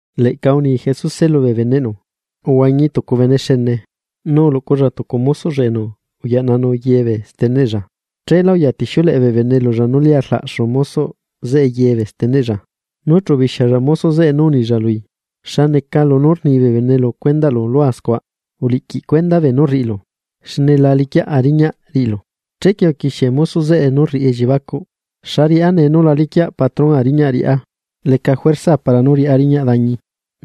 Leꞌca uni Jesuse lubee beneꞌnu: ―Uhuañi tucu bene xene, nu uluꞌculla tucu mosoꞌlla enu uyaꞌnanu ye bee steneꞌlla, cheela uyatixiuleꞌe bee bene lulla nú lia rlaꞌxu mosoꞌ zeꞌe ye bee steneꞌlla. Nu chu ubixialla mosoꞌ zeꞌe nu unilla lui: “¿Xa neca lunú rni bee bene lu cuendaꞌlu scua? Uliꞌquiꞌ cuenda beenú rriꞌilu, xne la liquiaꞌa riñaꞌ riꞌilu.” Chequie uquixie mosoꞌ zeꞌe nú rriꞌi elliebacuꞌ: “¿Xa riꞌá nee nu la liquiaꞌ patrónꞌa riñaꞌ riꞌá? Leca juerzaa para nú riꞌá riñaꞌ dañi,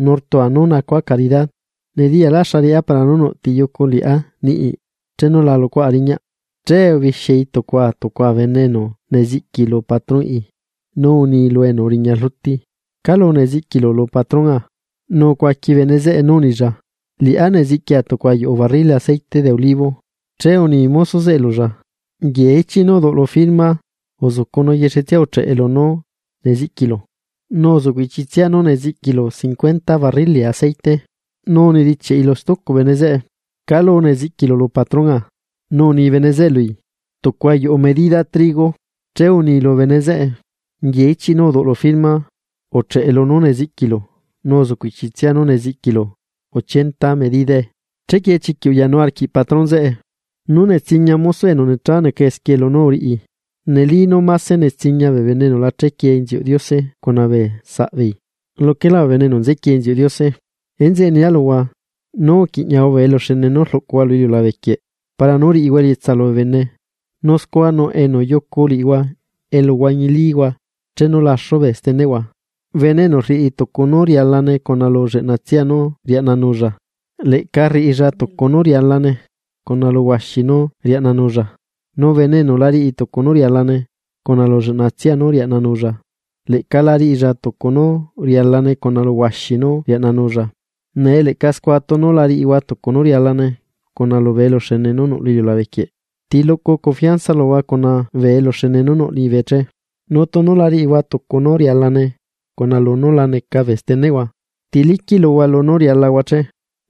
nu rtua nú nacua caridad. Nediyala xa riꞌá para nú nuꞌ ti yucu liꞌá niꞌi chenu la luꞌcuaꞌa riñaꞌ.” Che ubixiai tucua tucua bene enu neziꞌqui lu patrónꞌi, nu uni lu enu uriña rluti: “¿Calu neziꞌquilu lu patronꞌa?” Nu ucuaqui bene zeꞌe nú unilla: “Liꞌá neziꞌquia tucu ayuꞌu barrili aceite de olivo.” Che uni mosoꞌ zeꞌe lulla: “Nguie ichiꞌ nú uduꞌlu firma uzucu nu yexetsia ucheꞌe lunú neziꞌquilu, nu uzuꞌcuꞌ ichitsia nú neziꞌquilu cincuenta barrili aceite.” Nu unedichiaꞌi lu stucu bene zeꞌe: “¿Calu neziꞌquilu lu patrónꞌa?” Nu uni bene zeꞌe lui: “Tucu ayuꞌu medida trigo.” Che uni lu bene zeꞌe: “Nguie ichiꞌ nú uduꞌlu firma. Ucheꞌe lunú neziꞌquilu nu uzuꞌcuꞌ ichitsia nú neziꞌquilu ochenta medidae.” Chequie chiquiꞌ uyanu arquiꞌ patrón zeꞌe nú netsiña mosoꞌ enu necha neca esquie lunú uriꞌi. Neli nú mase netsiña bee bene enu la chequie inziuꞌ Diose cuna bee saꞌbeei, luquelá bee bene enu nzequie inziuꞌ Diose. ’Enzeꞌe nia luhua: “Nú uquiꞌñahua bee eluxene nú rluꞌcuhua lu iliulabe quieꞌ para nú riꞌihua elietsa lubee bene, nu scua nuꞌ enu yucu liꞌihua elu huañilíhua chenu laxu bee steneꞌhua.” ’Bene enu rriꞌi tucu nú rialane cuna lu lleꞌnatsia nú riaꞌnanulla, leꞌca rriꞌilla tucu nú rialane cuna lu huaxi nú riaꞌnanulla, nu bene enu la riꞌi tucu nú rialane cuna lu lleꞌna tsia nú riaꞌnanulla, leꞌca la riꞌilla tucu nú rialane cuna lu huaxi nú riaꞌnanulla. Nee leꞌca scua tunu la riꞌihua tucu nú rialane cuna lubee eluxene nú nuꞌ lu iliulabe quieꞌ, ¿ti luꞌcu confianza luhua cuna bee eluxene nú nuꞌ liñibe che? Nu tunu la riꞌihua tucu nú rialane cuna lunú la neca bee steneꞌhua, ¿ti liquiꞌ luhua lunú rialahua che?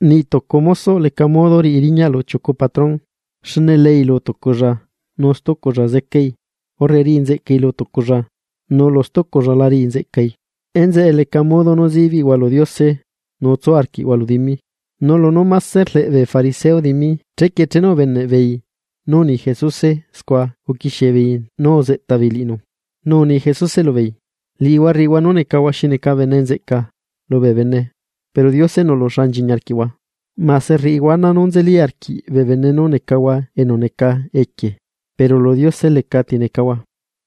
’Niꞌ tucu mosoꞌ leca modo riꞌi riñaꞌ lu chiucu patrón, xne leei lu tuculla, nu stuculla zecai, urre riꞌi nzeꞌcai lu tuculla, nu lu stuculla la riꞌi nzeꞌcai. Enzeꞌe leca modo nú zibiꞌhua lu Diose nu tsu arquiꞌhua lu dimi. Nu lunú máse rleꞌ bee fariseo dimi, chequie chenu ubeneꞌ beei nú uni Jesuse scua uquixie beei nú uzeꞌta beei liꞌinu. Nu uni Jesuse lubeei: ―Liꞌihua rriꞌihua nú necahua xi neca bene nzeꞌca lubee bene. Pero Diose nuꞌlu xa nchiñi arquiꞌhua. Mase rriꞌihua ana nú nzeli arquiꞌ bee bene nú necahua enu neca equie, pero lu Diose lecati necahua.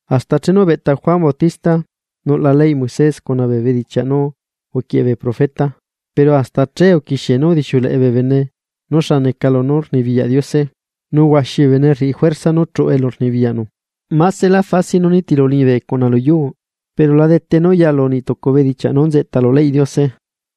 ’Hasta chenu ubeꞌta Juan Bautista. Nuꞌla leyꞌ Moisés cuna bee bedichiaꞌ nú uquieꞌe bee profeta, pero hasta che uquixie nú udixiuleꞌe bee bene nú xa neca lunú rnibiyaꞌ Diose, nu huaxi bee bene rriꞌi juerza nú chuꞌu elu rnibiyaꞌnu. ’Másela fácil nú nitilu liñibe nu lu yuu, pero la dete nú yalu niꞌ tucu bedichiaꞌ nú nzeꞌta lu leyꞌ Diose.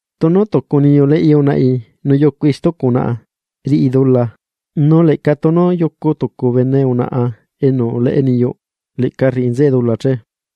’Tunu tucu niyu leꞌi unaꞌi nu yucui stucu unaꞌa, riꞌi dula, nu leꞌca tunu yucu tucu bene unaꞌa enu uleꞌe niyuꞌ, leꞌca riꞌi nzeꞌe dula che.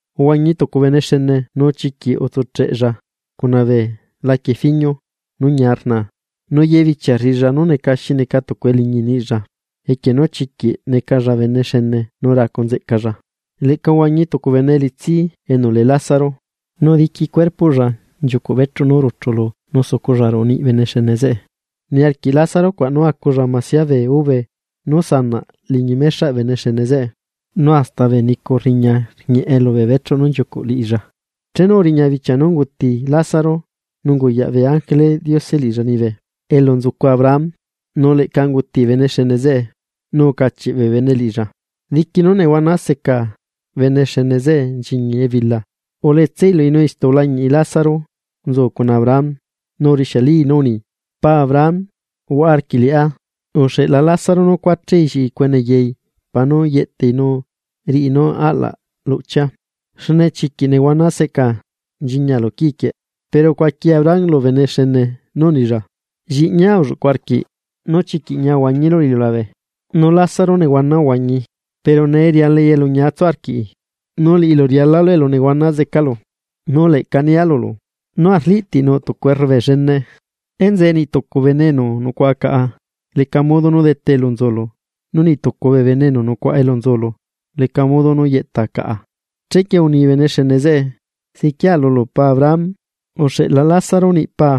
’Uhuañi tucu bene xene nu chiquiꞌ utsucheꞌella cuna bee laquie fiñu nú ñia rnaa nu ye bichia rriꞌilla nú neca xi neca tucu eliñi niꞌilla, equie nú chiquiꞌ necalla bene xene nu racu nzeꞌcalla. Leꞌca uhuañi tucu bene elitsi enu lee Lázaro, nu diqui beꞌlaꞌlla nchiucuꞌ bechuꞌ nú ruchulu nu suculla ruꞌu niꞌ bene xene zeꞌe. Niarquiꞌ Lázaro cuaꞌ nú aculla masia bee ube nú sanaꞌ liñi mexaꞌ bene xene zeꞌe, nu hasta bee nicu rriña rñieꞌe lu beechuꞌ nú nchiucuꞌ liꞌilla. Chenu uriña bichia nú unguti Lázaro, nu unguyaꞌ bee ángeleꞌ Diose liꞌilla liñibe elu nzucu Abraham. Nu leꞌca unguti bene xene zeꞌe, nu ucachiꞌ bee bene liꞌilla. Diqui nú nehuana seca bene xene zeꞌe nchiñi ebila, uletsai lui nu istu ulañiꞌi Lázaro nzu cuna Abraham. Nu urixialii nú uni: “¡Paa Abraham, uhuaꞌa arquiꞌ liꞌá! Uxeꞌla Lázaro nú cuachai lliꞌi cuene yai para nú yeꞌtai nu riꞌi nú aꞌlaꞌ luꞌchia, xne chiquiꞌ nehuana seꞌca nchiñia lu quii quieꞌ.” Pero ucuaqui Abraham lu bene xene nú unilla: “Lliꞌñia ulluꞌcu arquiꞌ nú chiquiꞌ ñia uhuañilu lu iliulabe, nu Lázaro nehuana uhuañii. Pero nee rialai elu ñia tsu arquiꞌi, nu liꞌilu rialalu elu nehuana zecalu.” Nu leꞌca nia lulu: “Nú arliꞌtiꞌ nuꞌ tucu errubee llene. Enzeꞌe niꞌ tucu bee enu nucuaꞌa caꞌa leca modo nú dete elu nzulu, nu niꞌ tucu bee enu nucuaꞌa elu nzulu leca modo nú yeꞌta caꞌa.” Chequie uni bene xene zeꞌe: “Ziquia lulu paa Abraham, uxeꞌla Lázaro niꞌ paa,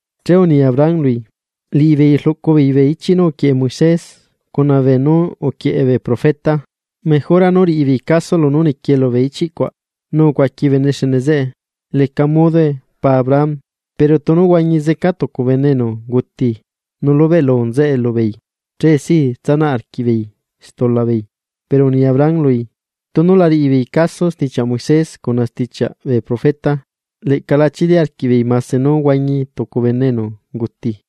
Che uni Abraham lui: “Liꞌibeei rluꞌcu beei bee ichiꞌ nú uquieꞌe Moisés cuna beenú uquieꞌe bee profeta, mejora nú riꞌi beei caso lunú niquie lubee ichiꞌ cuaꞌ.” Nu ucuaqui bene xene zeꞌe: “Leca modoe paa Abraham, pero tunu huañi zeca tucu bene enu unguti, nu lubeꞌlu nzeꞌe lubeei, che si tsanaꞌ arquiꞌbeei stula beei.” Pero uni Abraham lui: “Tunu la riꞌi beei caso stichiaꞌ Moisés cuna stichiaꞌ bee profeta, leꞌca la chili arquiꞌbeei mase nú huañi tucu bene enu unguti.”